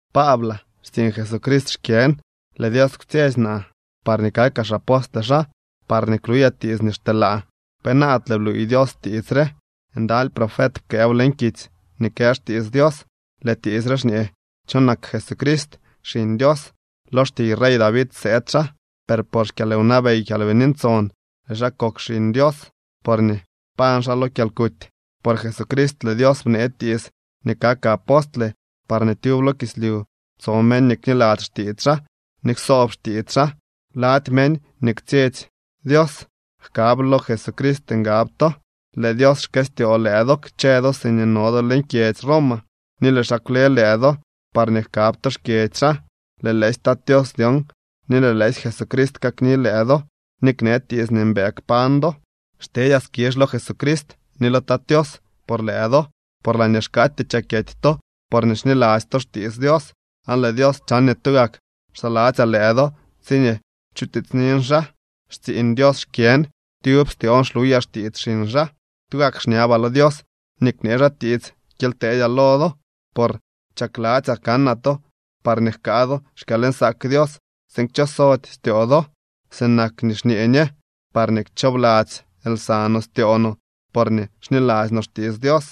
Paablaa. Xtsiiñ Jesucrist xkyën. Lëë Dios kwtsyetsy naa parñee kakaa xapostle xaa parñee kluyaa tiits nii xteelaa. Penaadle bluuy Dios tiits re. Ndaly profet pkëëw leñ kitsy nii kë xtiits Dios. Lëë tiits re xñee cho nak Jesucrist, Xiñ Dios. Lo xtiiy rey David sëëd xaa. Per por xkyalwnabey Kyalbini Ntson lëë xaa kok Xiñ Dios, porñee pañ xaa lo kyalkuty. Por Jesucrist lëë Dios bnee tiits nii kakaa apostle parñee tyub lo kislyu tso meñ nii kniladzy xtiits xaa ni ksoob xtiits xaa. Lady meñ nii kwtsyetsy Dios jkab lo Jesucrist ngab to. Lëë Dios xkëstyoo lëë do kchë do siñee no do leñ kyedzy Roma, ni lëë xaa kwle lëë do parñee jkab to xkyedzy xaa. Lëë lëësy Tat Tios dyon ni lëë lëësy Jesucrist kakni lëë do ni knee tiits nii mbëë kpañ do. Xtedyaa skizh lo Jesucrist ni lo Tat Tios por lëë do, por laañee xkaatyee chakyety to porñee xniladzy to xtiits Dios. Aan lëë Dios chan nii tugak xsaladzyaa lëë do tsiñee chutiitsnin xaa. Xtsiiñ Dios xkyën. Tyub styoon xluyaa xtiits xiñ xaa. Tugak xñabaa lo Dios nii knee xaa tiits kyely teedyaa lo do. Por chakladzyaa kanaa to parñee jkaa do xkyalnsaak Dios tsiin kchosody styoo do, sinak nii xñee ñe, parñee kchoobladzy lsa no styoo no porñee xniladzy no xtiits Dios.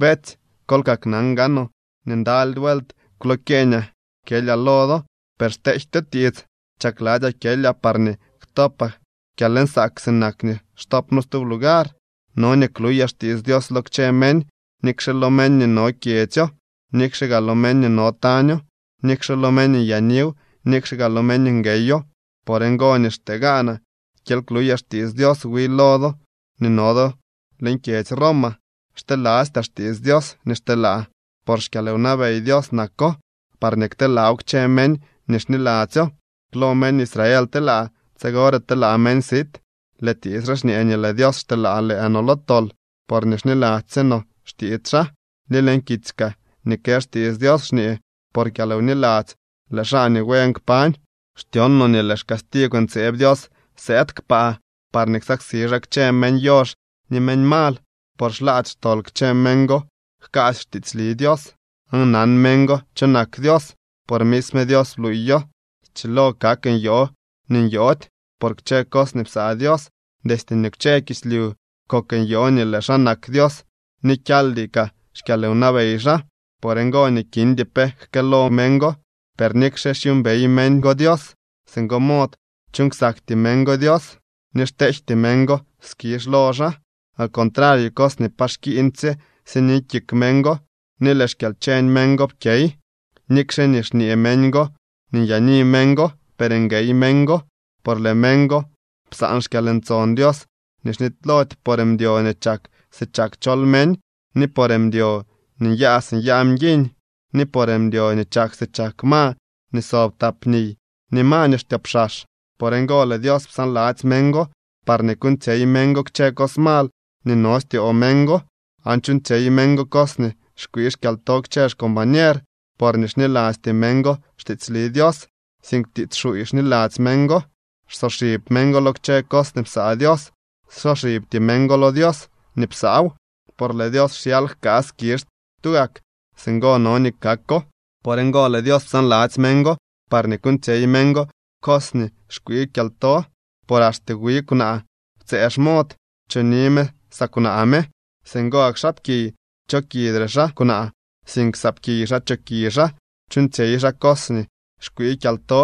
Beetsy, kol kaknan gaanoo nii ndaly vuelt kwlokyeeñaa kyelyaa lo do, per xtejtyo tiits. Chakladzyaa kyelyaa parñee ktopaa kyalnsaak sinak nii xtopno stub lugar. No nii kluyaa xtiits Dios lo kchë meñ, nikxe lo meñ nii no kyedzyo, nikxe gaa lo meñ nii no taño, nikxe lo meñ nyaaniw, nikxe gaa lo meñ ngueyo. Por ngo nii xtee gaanaa kyely kluyaa xtiits Dios wi lo do nii no do leñ kyedzy Roma. Xtelastyaa xtiits Dios nii xteelaa, por xkyalwnabey Dios nako parñee kteelaaw kchë meñ nii xniladzyo. Klo meñ Israel telaa. Tsigore telaa meñ sit. Lëë tiits re xñee nii lëë Dios xteelaa lëë no lo tol porñee xniladzy sye no xtiits xaa. Ni leñ kitsy kaa nii kë xtiits Dios xñee: “Por kyalwniladzy lëë xaa nii buen kpañ.” Xtyon no nii lëë xcastigw ntseeb Dios sëëd kpaa parñee ksaksi xaa kchë meñ yox ni meñ mal, por xlaady xtol kchë meñ go jkaasy xtiitsli Dios. Aan nan meñ go cho nak Dios, por misme Dios bluuyo. Schilo kak nyoo nii nyoody por kchë cos nii psaa Dios. Destye nii kwche kislyu kok nyoo nii lëë xaa nak Dios ni kyaaldy kaa xkyalwnabey xaa. Por ngo nii kindy pe jkëëlo meñ go. Per nikxe xyuumbey meñ go Dios singo mod, chuuñ ksakty meñ go Dios ni xteejty meñ go skizh lo xaa. Al contrario cos nii pa xkiiñdysye sini kik meñ go, ni lëë xkyalcheñ meñ go pkyey. Nikxe nii xñee meñ go nii nyaani meñ go, per nguey meñ go. Por lëë meñ go psaan xkyalntson Dios nii xnitylody por mdyo nii chak si chak chol meñ, ni por mdyo nii nyaa si nyaa mguiñ, ni por mdyo nii chak si chak ma nii sob tap niy, ni ma nii xtyoopxax. Por ngo lëë Dios psaanladzy meñ go parñee kuuñtsyey meñ go kchë cos mal nii no styoo meñ go. Aan chuuñtsyey meñ go cos nii xkwii kyalto kchë xcombañer, porñee xnilasty meñ go xtiitsli Dios, sink tiits xuuy xniladzy meñ go. Xsoxib meñ go lo kchë cos nii psaa Dios. Xsoxibty meñ go lo Dios nii psaaw. Por lëë Dios xyal jkaa skizh tugak. Singo no nii kako. Por ngo lëë Dios psaanladzy meñ go parñee kuuñtsyey meñ go cos nii xkwii kyalto. Por axte wi kwnaa ptsëë xmod. Choni me saa kwnaa me. Singo gak xaapkiy, chokidre xaa kwnaa, sink saapkiy xaa choki xaa. Chuuñtsyey xaa cos nii xkwii kyalto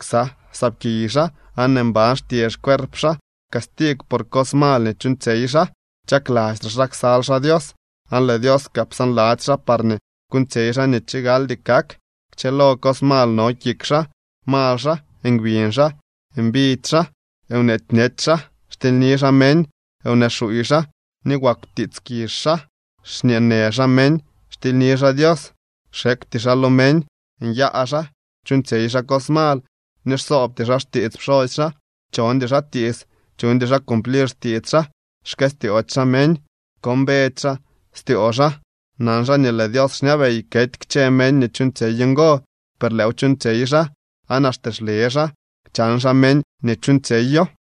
ksa saapkiy xaa, aan mban xtye xcuerp xaa castigw por cos mal nii chuuñtsyey xaa. Chaklastre xaa ksal xaa Dios, aan lëë Dios kaa psaanladzy xaa parñee kuuñtsyey xaa nii chigaldy kak. Kchëlo cos mal no kik xaa, mal xaa, ngbiñ xaa, mbidy xaa, nweety bñech xaa, xtilyni xaa meñ, wnee xuuy xaa, ni wagw tiits kizh xaa. Xñeenë xaa meñ, xtilyni xaa Dios, xekwty xaa lo meñ, nyaa xaa, chuuñtsyey xaa cos mal, ni xsoobty xaa xtiits pxosy xaa. Chondy xaa tiits, chuñdy xaa cumplir xtiits xaa, xkëstyoody xaa meñ, xkombedy xaa styoo xaa. Nan xaa nii lëë Dios xñabey kety kchë meñ nii chuuñtsyey ngo, per lëëw chuuñtsyey xaa, aan axte xle xaa chan xaa meñ nii chuuñtsyeyo.